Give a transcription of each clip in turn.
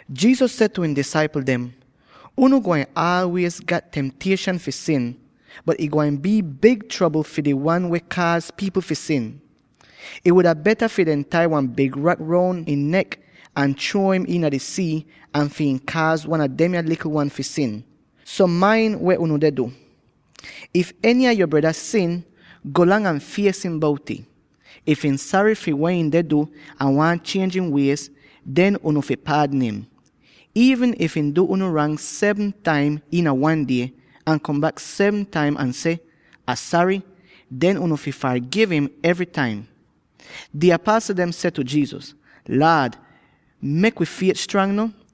Jesus seh tu ihn disaipl dem, “Unu gwain aalwiez gat temtieshan fi sin, bot ih gwain bii big trobl fi di wan weh kaaz pipl fi sin! Ih wuda beta fi dehn tai wan big rak roun ihn nek ahn chruo im iina di sii an fi ihn kaaz wan a demya likl wan fi sin. So main weh unu deh du! “If eny a yo breda sin, golang ahn fies im bout'ih; if ihn sary fi weh ihn deh du ahn waahn chienj ihn wiez, den unu fi paadn im. Iivn if ihn du unu rang seven taim iina wan die, ahn kom bak seven taim ahn seh, ‘Ah sary,’ den unu fi fargiv im evry taim.” Di apasl dem seh tu Jesus, “Laad, mek wi fiet stranga no.”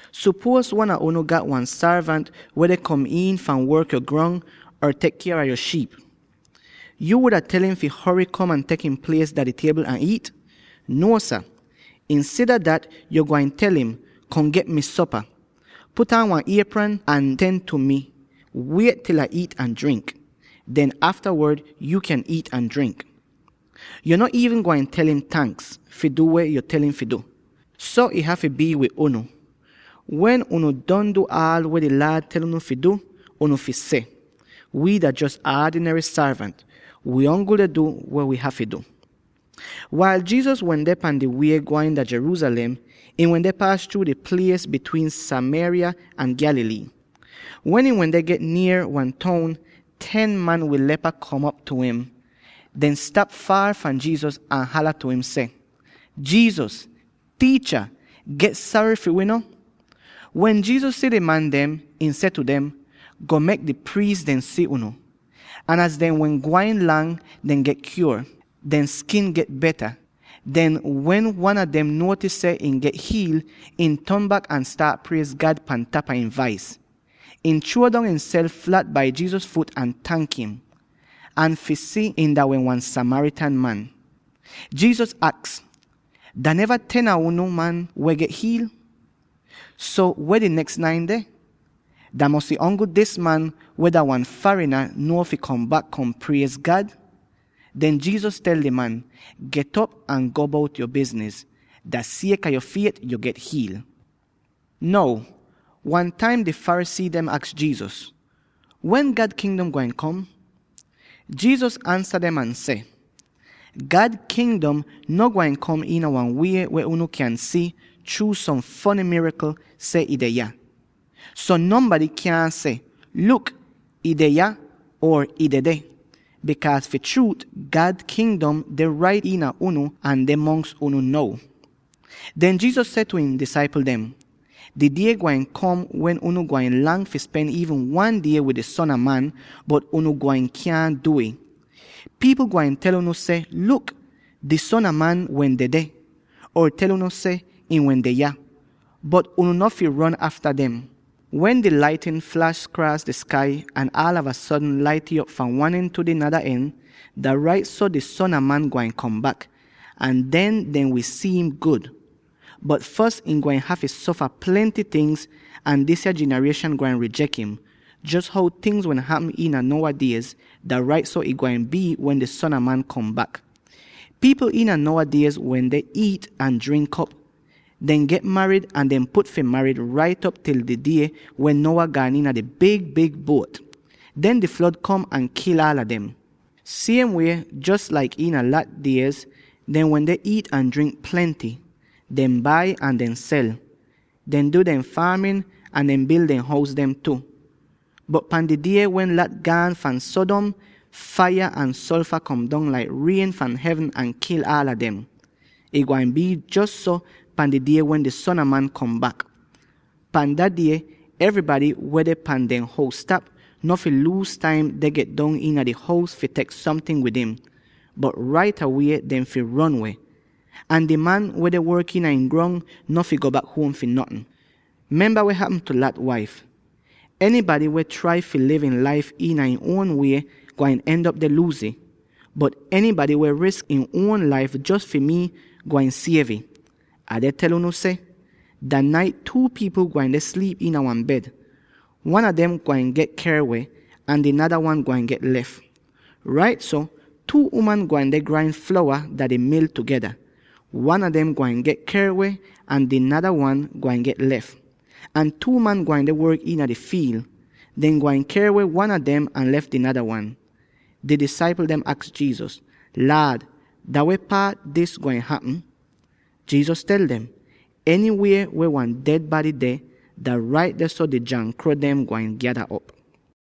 “Sopuoz wan a unu gat wan sorvant weh deh kom iin fahn work yo grong, or tek kier a yo shiip. Yo wuda tel im fi hory kom ahn tek ihn plies dah di tiebl ahn iit? Nuo sah. Insida dat yo gwain tel im, ‘Kom get mi sopa. Put aan wan iepran ahn ten tu mi; wiet til Ah iit ahn drink. Den aftawod yuu kyan iit ahn drink.’ Yo no iivn gwain tel im ‘tanks’ fi du weh yo tel im fi du! So ih hafy bii wid unu. Wen unu don du aal weh di Laad tel unu fi du, unu fi seh, ‘Wi dah jos aadinary sorvant; wi ongl deh du weh wi hafy du.’” Wail Jesus wende pan di wie gwain Jerusalem, ihn wende paas chruu di plies bitwiin Samaria ahn Galilee. Wen ihn wende get nier wan toun, ten man weh gat leprosy kom tu im. Dehn stap faar fahn Jesus ahn hala tu im seh, “Jesus, Tiicha, get sary fi wi no!” Wen Jesus si di man dem, ihn seh tu dem, “Go mek di priis dem si unu.” Ahn az dehn wehn gwain lang, dehn get kyuor; dehn skin get beta! Den, wen wan a dem nuotis seh ihn get hiil, ihn ton bak ahn staat priez God pan tapa ihn vais. Ihn chruo dong ihnself flat bai Jesus fut ahn tank im. Ahn fi si ihn dah wehn wan Samaritan man, Jesus aks, “Dah neva ten a unu man weh get hiil? So weh di neks nine deh? Dah mosy ongl dis man weh dah wan farina nuo fi kom bak, kom priez God?” Den Jesus tel di man, “Get'op ahn go bout yo bizniz. Dah sieka yo fiet, yo get hiil.” Now, wan taim di Pharisee dem aks Jesus, “Wen God Kingdom gwain kom?” Jesus ansa dem ahn seh, “God Kingdom no gwain kom iina wan wie weh unu kyan si chruu som fony mirakl seh ih deh yah. So nonbady kyaahn seh, ‘Luk, ih deh yah,’ or ‘Ih dedeh!’ Bikaaz fi chruut, God Kingdom deh rait iina unu ahn deh mongs unu now.” Den Jesus seh tu ihn disaipl dem, “Di die gwain kom wen unu gwain lang fi spen iivn wan die wid di Son a Man, bot unu gwain kyaahn du'ih. Pipl gwain tel unu seh, ‘Luk, di Son a Man wehn dedeh!’ or tel unu seh ihn wende yah, bot unu no fi ron afta dem. Wen di laitnin flash kraas di skai ahn aalava sodn lait'ih op fahn wan en tu di nada en, dah rait so di Son a Man gwain kom bak, ahn den dehn wi si'im gud. Bot fos ihn gwain hafy sofa plenty ting, ahn disya jinarieshan gwain rijek im. Jos how tingz wehn hapm iina Noah diez, dah rait so ih gwain bii wen di Son a Man kom bak. Pipl iina Noah diez wende iit ahn drink op, deh get marid ahn deh put fi marid rait op til di die wen Noah gaan iina di big-big buot. Den di flod kom ahn kil aala dem. Siem wie, jos laik iina Lot diez, dehn wende iit ahn drink plenty, deh bai ahn deh sel; deh du dehn faamin, ahn deh bil dehn hous dem tu. Bot pan di die wen Lot gaan fahn Sodom, faiya ahn solfa kom dong laik rien fahn hevn ahn kil aala dem. Ih gwain bii jos so pan di die wen di Son a Man kom bak. Pahn Dat Die, enybady weh deh pan dehn hous-tap, no fi luuz taim deh get dong iina di hous fi tek somting wid im, bot rait awie dehn fi ron weh. Ahn di man weh deh work iina ihn grong, no fi go bak huom fi notn. “Memba weh hapm tu Lot waif! Enybady weh trai fi liv ihn laif iina ihn uon wie, gwain end'op deh luuz ih; bot enybady weh wi risk ihn uon laif jos fi mii, gwain siev ih. Ah deh tel unu seh: dah nait two pipl gwain deh sliip iina wan bed; wan a dem gwain get ker weh, ahn di nada wan gwain get lef. Rait so, two uman gwain deh grain flowa dah di mil tugeda; wan a dem gwain get ker weh ahn di nada wan gwain get lef. Ahn two man gwain deh work iina di fiil; dehn gwain ker weh wan a dem, ahn lef di nada wan.” Di disaipl dem aks Jesus, “Laad, dah weh paat dis gwain hapm?” Jesus tel dem, “Enywie weh wan ded bady deh, dah rait dehso, di jankro dem gwain gyada op.”